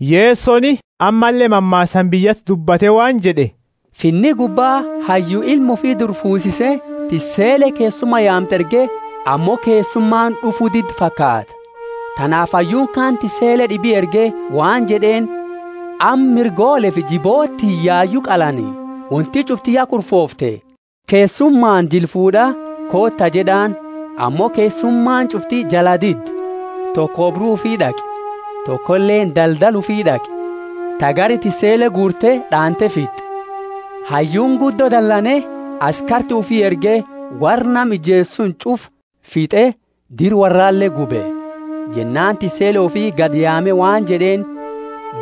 Yesoni ammalle mammaasaani biyyati dubbate waan jed'e, Finni gubba hayyu ilma ufi dubra fuusise, tissele keessuma yaamtu erge, ammo keessumaani d'ufu didde fakaata. Tanaafi hayyuuni kaani tissele d'ibi erge waan jed'eeni, Amma mirgoolefi jiboota tiyya yayu qalani, wonti ch'ufti ya kurfoofte, keessumaani jila fuud'a, Koota jed'aani. Ammo keessumaani ch'ufti jalaa didde; toko oobru ufi d'aqe, tokoleeni daldala ufi d'aqe; ta gari tissele guurte d'aante fitt'e. Hayyuuni guddo dalane, askarti ufi erge, worra nama ijeese suni ch'ufa fit'e dira worrale gube. Jennaani tissele ufi gadi yaame waan jed'eeni,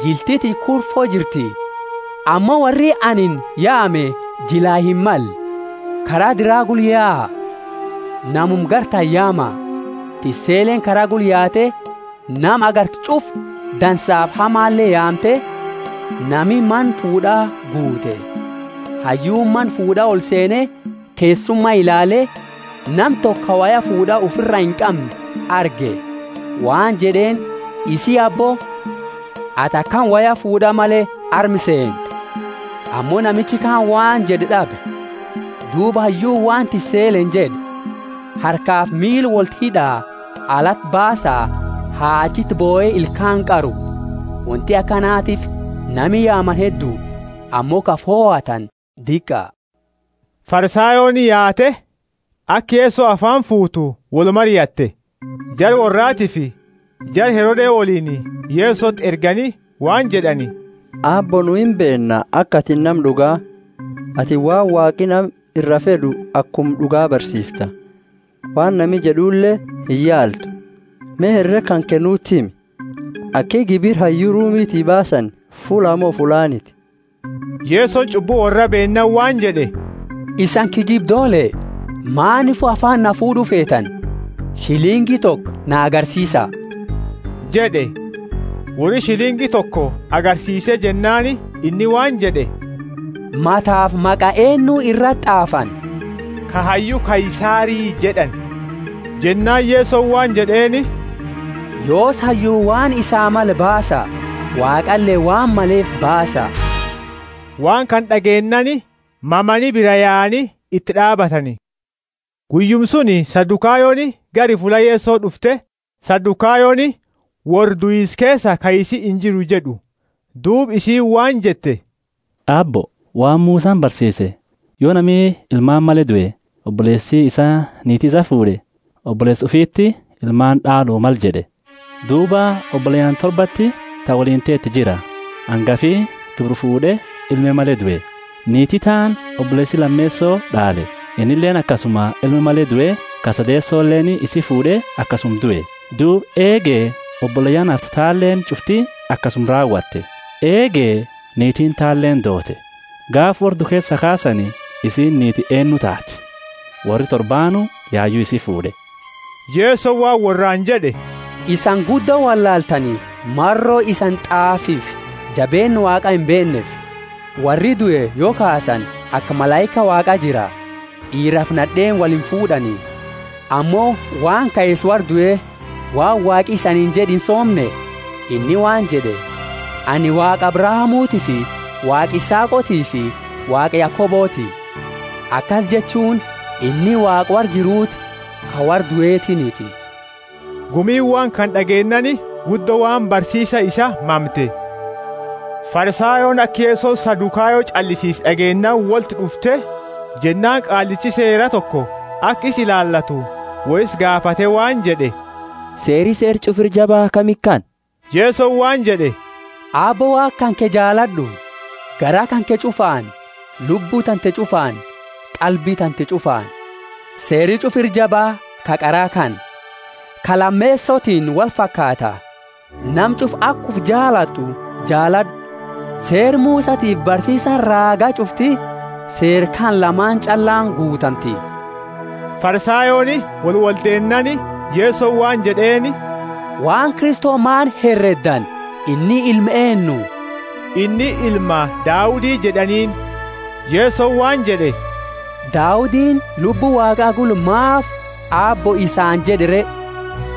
Jilti tiyya kurfo jirti, ammo worri anini yaame jilaa himmalle. Kara dira gula yaa, namuma gartani yaama. Tisseleeni kara gula yaate nama agarte ch'ufa dansaafi hamale yaamte, nami mana fuud'aa guute. Hayyuuni mana fuud'aa olseene keessuma ilaale; nama toko ka woya fuud'a ufira inqamne arge, waan jed'eeni, Isii, abbo, atini akami woya fuud'a male arma seente? Ammo namichi kaani waan jed'u d'abe. Duuba hayyuuni waan tisseleeni jed'e, Harkafi miila wolti hid'a, alati baasa, ha achiti bohe ilkaani qaru. Wonti akanatiifi nami yaamani heddu, ammo ka fohatani diqa. Farisayooni yaate aka Yeso afaani fuutu wolmariatte. Jara worraatiifi jara Herode woliini Yesoti ergani waan jed'ani, Aabbo, nu imbeenna aka atini nama d'uga, atini waan Waaqi nama ira fed'u akuma d'uga barsiifta; waan nami jed'ule iyaaltu. Me, herega kanke nuti himi. Aki gibira hayyu Rumiti baasani fullaa mo fullaaniti? Yesoni ch'ubbu worra beennaani waan jed'e, Isani kiyyibdoole! Maanifu afaani na fuud'u feetani? Shilingi toko na agarsiisa jed'e. Worri shilingi toko agarsiise jennaani inni waan jed'e, Matafi maqa eennu irati t'aafani? Ka hayyu Kaisari jed'ani. Jennaani Yesoni waan jed'eeni, Yoosi hayyu waan isaa male baasa, Waaqale waan maleefi baasa. Waan kana d'ageennaani mamani, biraa yaani iti d'aabatani. Guyyuma suni Sadukayoni gari fulla Yeso d'ufte. (Sadukayoni worra, Duisa keesaa kaisi injiru jed'u.) Duuba isiini waan jette, Aabbo, waan Musani barsiise, Yo nami ilmaani male due, oboleesi isaa niiti isaa fuud'e, oboleesa ufiti ilmaani d'alu male jed'e. Duuba oboleyaani torbaati ta woliini teetu jira, angafi dubra fuud'e ilme male due, Niiti taani oboleesi lameeso d'aale, innileeni akasuma ilma male due ka sadeesoleeni isi fuud'e akasuma due, duuba eege oboleyaani hafte taaleni ch'ufti akasuma raawate. Eege niitiini taleeni doote. Gaafa worra due kaasani isiini niiti eennu taati? Worri torbaanu yayu isii fuud'e. Yesoni waan worraani jed'e, Isani guddo wollaaltani, maro isani T'aafifi jabeenna Waaqa imbeenneefi. Worri due, yo kaasani, aka malaika Waaqa jira, d'iirafi nad'eeni wolimfuud'ani. Ammo, waan kaisa worra due, waan Waaqi isaniini jed'e insoomne? Inni waan jed'e, Anini Waaqa Abrahamutiifi Waaqa Isaaqotiifi Waaqa Yakoboti. Akasi jechuuni, inni Waaqa worra jiruuti, ka worra duetiiniti. Gumiini waan kana d'ageennaani guddo waan barsiisa isaa mamte. Farisayooni aka Yesoni Sadukayo ch'allisiise d'ageennaani wolti d'ufte, jennaani qaallichi Seera toko aka isa ilaalatu wo isa gaafate waan jed'e, Seeri Seera ch'ufa ira jaba kami kana? Yesoni waan jed'e, Aabbo Waaqa kanke jaalad'u, garaa kanke ch'ufaani, lubbu tante ch'ufaani, qalbi tante ch'ufaani. Seeri ch'ufa ira jaba ka qara kana. Ka lameesotiini wolfakaata: Nama ch'ufa aka ufi jaalatu jaalad'u. Seera Musatiifi barsiisani raaga ch'ufti seera kana lamaani ch'allaani guutamti. Farisayooni wolwoldeennaani, Yesoni waan jed'eeni, Waan Kristo maani hereddani? Inni ilma eennu? Inni ilma Daudi jed'aniini. Yesoni waan jed'e, Daudini, Lubbu Waaqa gula, maafi Aabbo isaani jed'e re?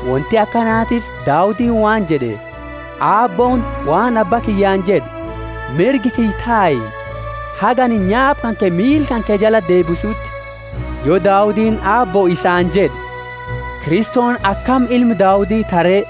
Wonti akanatiifi Daudini waan jed'e, Aabbooni waan Abba kiyyaani jed'e: Mirga kiyya tai, haga anini nyaapa kanke miila kanke jalati deebisuti. Yo Daudini Aabbo isaani jed'e, Kristoni akami ilma Daudi taha re?